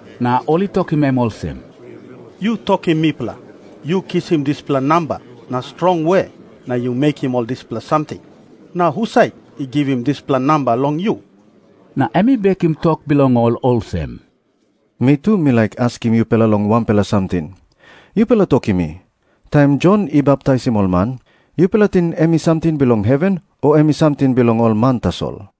Na ol i tokim em olsem, “Yu tokim mipela, yu kisim dispela namba na strong we na yu mekim ol dispela samting? Na husat i givim dispela namba long yu?” Na em i bekim tok bilong ol olsem, “Mi tu mi laik askim yupela long wanpela samting. Yupela tokim mi, taim Jon i baptaisim ol man, yupela i ting em i samting bilong heven, o em i samting bilong ol man tasol?”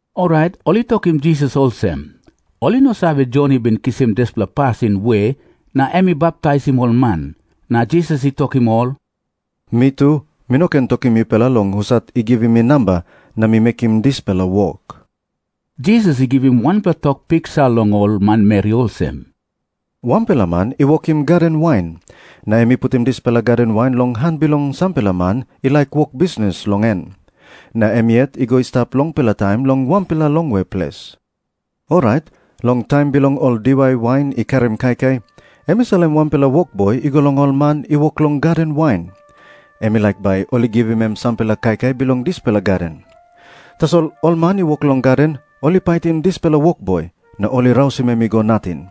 Orait ol i tokim Jisas olsem, ol i no save, Jon i bin kisim dispela pasin we na em i baptaisim ol man. Na Jisas i tokim ol olsem, “Mi tu mi no ken tokim yupela long husat i givim mi namba na mi mekim dispela wok.” Jisas i givim wanpela tok piksa long ol manmeri olsem, “Wanpela man i wokim gaden wain. Na em i putim dispela gaden wain long han bilong sampela man i laik wok bisnis long en. Na em yet i go i stap longpela taim long wanpela longwe ples. Orait long taim bilong ol diwai wain i karim kaikai, em i salim wanpela wokboi i go long ol man i wok long gaden wain. Em i laik bai ol i givim em sampela kaikai bilong dispela gaden. Tasol ol man i wok long gaden ol i paitim dispela wokboi na ol i rausim em i go nating.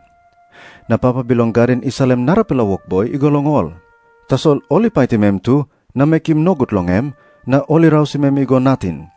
Na papa bilong gaden i salim narapela wokboi i go long ol. Tasol ol i paitim em tu na mekim nogut long em, na ol i rausim em i go nating.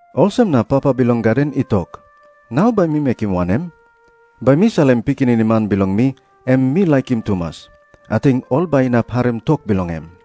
Olsem na papa bilong gaden i tok, ‘Nau bai mi mekim wanem? Bai mi salim pikinini man bilong mi, em mi laikim tumas. Ating ol bai inap harim tok bilong em.’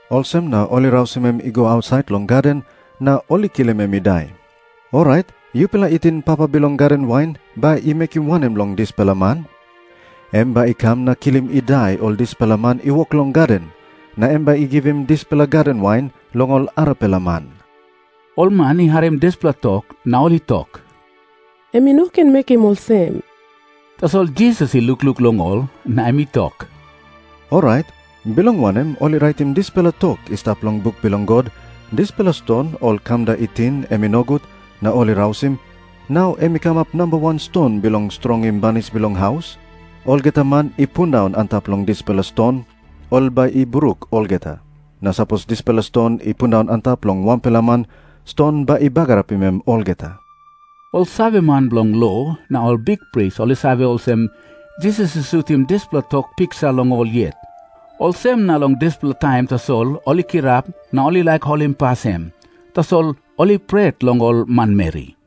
Olsem na ol i rausim em i go ausait long gaden, na ol i kilim em i dai. “Orait yupela i ting papa bilong gaden wain bai i mekim wanem long ol dispela man? Em bai i kam na kilim i dai ol dispela man i wok long gaden. Na em bai i givim dispela gaden wain long ol arapela man.” Ol man i harim dispela tok, na ol i tok, “Em i no ken mekim olsem.” Tasol Jisas i lukluk long ol, na em i tok, “Orait bilong wanem ol i raitim dispela tok i stap long buk bilong God, ‘Dispela ston ol kamda i ting em i nogut na ol i rausim, nau em i kamap namba wan ston bilong strongim banis bilong haus’? Olgeta man i pundaun antap long dispela ston, ol bai i bruk olgeta. Na sapos dispela ston i pundaun antap long wanpela man, ston bai i bagarapim em olgeta.” Ol saveman bilong lo na ol bikpris ol i save olsem, Jisas i sutim dispela tok piksa long ol yet. Olsem na long dispela taim tasol ol i kirap na ol i laik holimpas em. Tasol ol i pret long ol manmeri.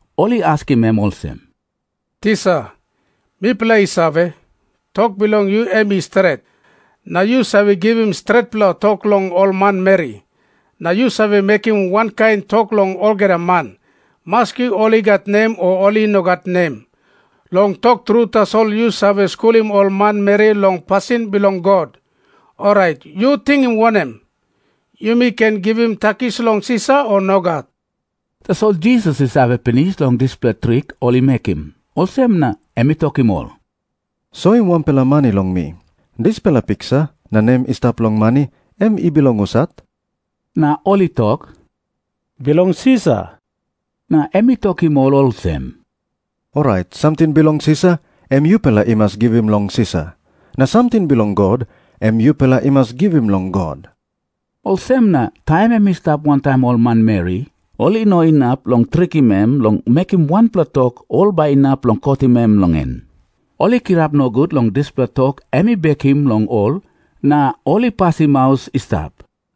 Ol i askim em olsem, “Tisa, mipela i save, tok bilong yu em i stret, na yu save givim stretpela tok long ol manmeri. Na yu save mekim wankain tok long olgeta man, maski ol i gat nem o ol i no gat nem. Long tok tru tasol yu save skulim ol manmeri long pasin bilong God. Orait, yu ting wanem? Yumi ken givim takis long Sisar, o nogat?” Tasol Jisas i save pinis long dispela trik ol i mekim. Olsem na em i tokim ol, “Soim wanpela mani long mi. Dispela piksa na nem i stap long mani em i bilong husat?” Na ol i tok, “Bilong Sisar.” Na em i tokim ol olsem, “Orait samting bilong Sisar, em yupela i mas givim long Sisar. Na samting bilong God, em yupela i mas givim long God.” Olsem na taim em i stap wantaim ol manmeri, ol i no inap long trikim em long mekim wanpela tok ol bai inap long kotim em long en. Ol i kirap nogut long dispela tok em i bekim long ol, na ol i pasim maus i stap.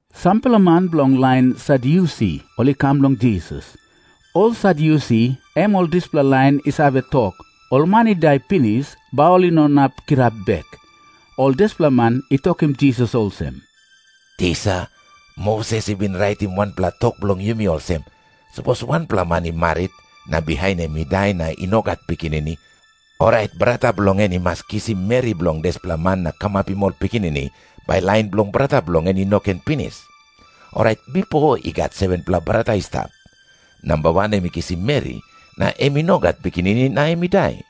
Sampela man bilong lain Sadyusi ol i kam long Jisas. Ol Sadyusi em ol dispela lain i save tok, ol man i dai pinis, bai ol i no inap kirap bek. Ol dispela man i tokim Jisas olsem, “Tisa, Moses i bin raitim wanpela tok bilong yumi olsem. Sapos wanpela man i marit, na bihain em i dai na i no gat pikinini, orait brata bilong en i mas kisim meri bilong dispela man na kamapim ol pikinini, bai lain bilong brata bilong en i no ken pinis. Orait bipo i gat 7-pela brata i stap. Namba wan em i kisim meri, na em i no gat pikinini na em i dai.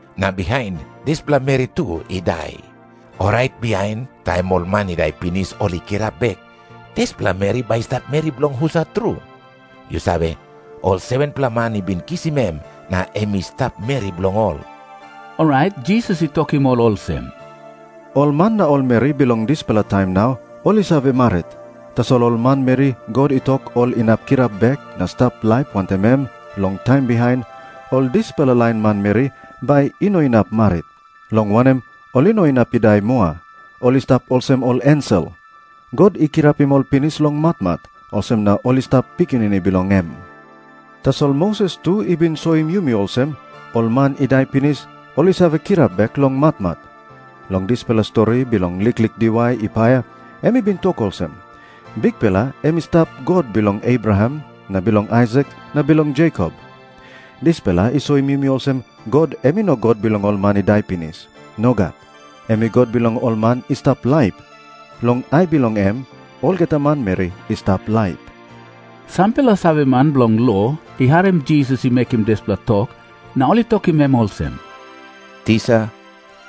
Na bihain dispela meri tu i dai. Orait bihain, taim ol man i dai pinis ol i kirap bek, dispela meri bai i stap meri bilong husat tru? Yu save, ol 7-pela man i bin kisim em na em i stap meri bilong ol.” Orait Jisas i tokim ol olsem, “Ol man na ol meri bilong dispela taim nau ol i save marit. Tasol ol manmeri God i tok ol inap kirap bek na stap laip wantaim em long taim bihain, ol dispela lain manmeri bai i no inap marit, long wanem, ol i no inap i dai moa. Ol i stap olsem ol ensel. God i kirapim ol pinis long matmat, olsem na ol i stap pikinini bilong em. Tasol Moses tu i bin soim yumi olsem ol man i dai pinis, ol i save kirap bek long matmat. Long dispela stori bilong liklik diwai i paia, em i bin tok olsem, Bikpela em i stap God bilong Abraham na bilong Aisak na bilong Jekop. Dispela i soim yumi olsem God em i no God bilong ol man i dai pinis. Nogat. Em i God bilong ol man i stap laip. Long ai bilong em, olgeta manmeri i stap laip.” Sampela saveman bilong lo i harim Jisas i mekim dispela tok, na ol i tokim em olsem, “Tisa,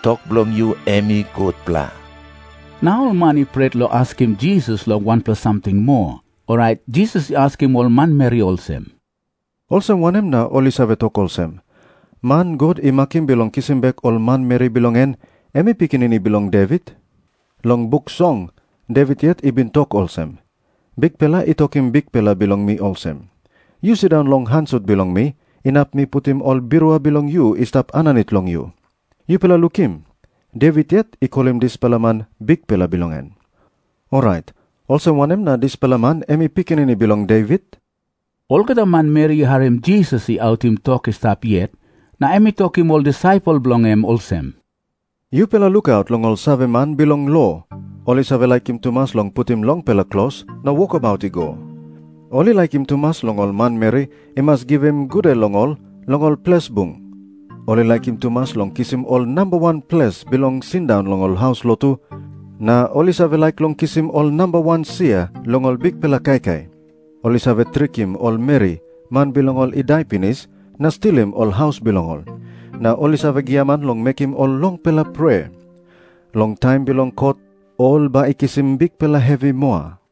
tok bilong yu em i gutpela.” Na ol man i pret long askim Jisas long wanpela samting moa. Orait Jisas i askim ol manmeri olsem, “Olsem wanem na ol i save tok olsem, man God i makim bilong kisim bek ol manmeri bilong en, em i pikinini bilong Devit? Long Buk Song, Devit yet i bin tok olsem, ‘Bikpela i tokim Bikpela bilong mi olsem, “Yu sindaun long han sut bilong mi inap mi putim ol birua bilong yu i stap aninit long yu.” ’ Yupela lukim. Devit yet i kolim dispela man Bikpela bilong en. Orait olsem wanem na dispela man em i pikinini bilong Devit?” Olgeta manmeri i harim Jisas i autim tok i stap yet, na em i tokim ol disaipel bilong en olsem, “Yupela lukaut long ol saveman bilong lo. Ol i save laikim tumas long putim longpela klos na wokabaut i go. Ol i laikim tumas long ol manmeri i mas givim gude long ol long ol ples bung. Ol i laikim tumas long kisim ol namba wan ples bilong sindaun long ol haus lotu, na ol i save laik long kisim ol namba wan sia long ol bikpela kaikai. Ol i save trikim ol meri, man bilong ol i dai pinis, na stilim ol haus bilong ol. Na ol i save giaman long mekim ol longpela prea. Long taim bilong kot ol bai i kisim bikpela hevi moa.”